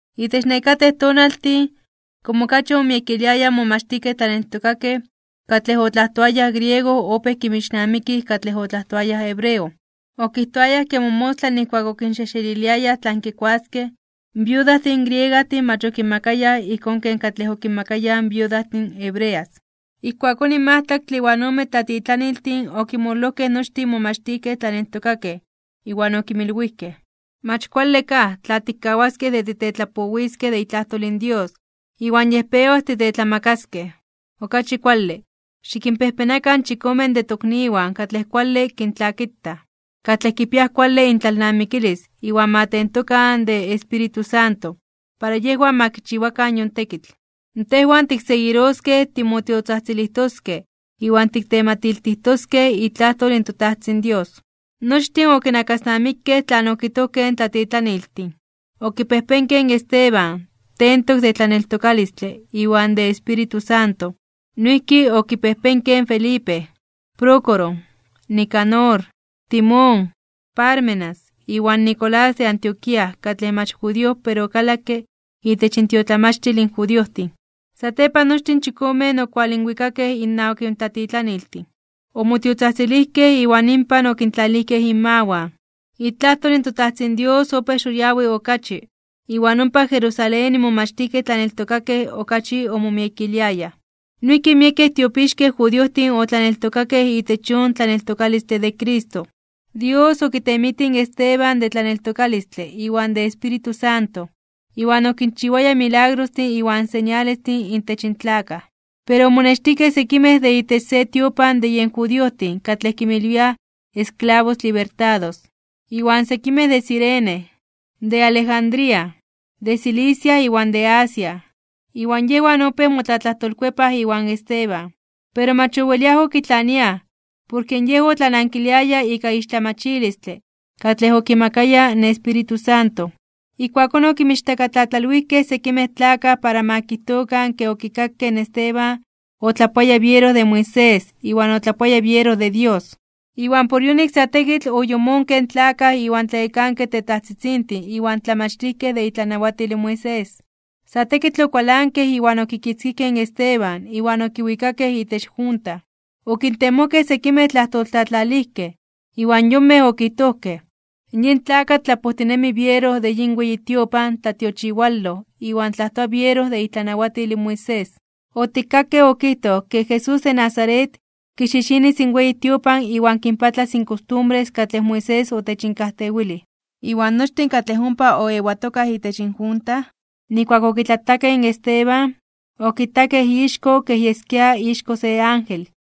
Itech nekatej tonaltin, komo okachi omomiekiliayaj in momachtijkej tlaneltokakej, katlej otlajtoayaj griego opéj kinmixnamikij katlej otlajtoayaj hebreo, okijtoayaj ke momostla nijkuak okinxejxeliliayaj tlan kikuaskej, in viudajtin griegajtin mach okinmakayaj ijkón ken katlej okinmakayaj viudajtin hebreas. Ijkuakón in majtlaktle iwan omen tlatitlaniltin okinmololojkej nochtin in momachtijkej tlaneltokakej iwan okinmilwijkej: ―Mach kuale kaj, tla tikkawaskej de titetlapowiskej de itlajtol in Dios, iwan yej pewas titetlamakaskej. Okachi kuale, xikinpejpenakan chikomen de tokniwan katlej kuale kintlakitaj, katlej kipiaj kuale intlalnamikilis iwan ma tentokan de Espíritu Santo, para yejwan ma kichiwakan yon tekitl. Tejwan tikseguiroskej timotiotzajtzilijtoskej iwan tiktematiltijtoskej itlajtol in toTajtzin Dios. Nochtin okinakasnamikej tlan okijtojkej in tlatitlaniltin, okipejpenkej in Esteban, tentok de tlaneltokalistle iwan de Espíritu Santo, noijki okipejpenkej in Felipe, Prócoro, Nicanor, Timón, Pármenas iwan Nicolás de Antioquía katlej mach judío pero okalakke itech intiotlamachtil in judiojtin. Satepan nochtin in chikomen okualinwikakej innawak in tlatitlaniltin, omotiotzajtzilijkej iwan inpan okintlalijkej inmawan. Itlajtol in toTajtzin Dios opéj xoyawi (xitini) okachi, iwan ompa Jerusalén in momachtijkej tlaneltokakej okachi omomiekiliayaj. Noijki miekej tiopixkej judiojtin otlaneltokakej itech yon tlaneltokalistle de Cristo. Dios okitemitij in Esteban de tlaneltokalistle iwan de Espíritu Santo, iwan okinchiwaya milagrostin iwan señalestin intech in tlakaj. Pero omonextijkej sekimej de itech se tiopan de yen judiojtin katlej kinmilwiaj Esclavos Libertados, iwan sekimej de Cirene, de Alejandría, de Cilicia iwan de Asia, iwan yejwan opéj motlatlajtolkuepaj iwan Esteban. Pero mach oweliaj okitlaniaj, porke yej otlanankiliaya ika ixtlamachilistle katlej okimakaya in Espíritu Santo. Ijkuakón okinmichtakatlatlalwijkej sekimej tlakaj para ma kijtokan ke okikakej in Esteban otlajtoaya biero de Moisés iwan otlajtoaya biero de Dios. Iwan por yonik sa tekitl oyomonkej in tlakaj iwan tlayekankej tetajtzitzintin iwan tlamachtijkej de itlanawatil in Moisés. Sa tekitl okualankej iwan okikitzkijkej in Esteban iwan okiwikakej itech junta. Okintemojkej sekimej tlajtoltlatlalijkej, iwan yonmej okijtojkej: ―Yin tlakatl tlapojtinemi biero de yin weyi tiopan tlatiochiwaloj iwan tlajtoa biero de itlanawatil in Moisés. Otikkakej okijtoj ke Jesús de Nazaret, kixixinis in weyi tiopan iwan kinpatlas in kostumbres katlej Moisés otechinkajtewilij. Iwan nochtin katlej ompa oewatokaj itech junta, nijkuak okitlatakej in Esteban, okitakej ixko kej yeskia ixko se ángel.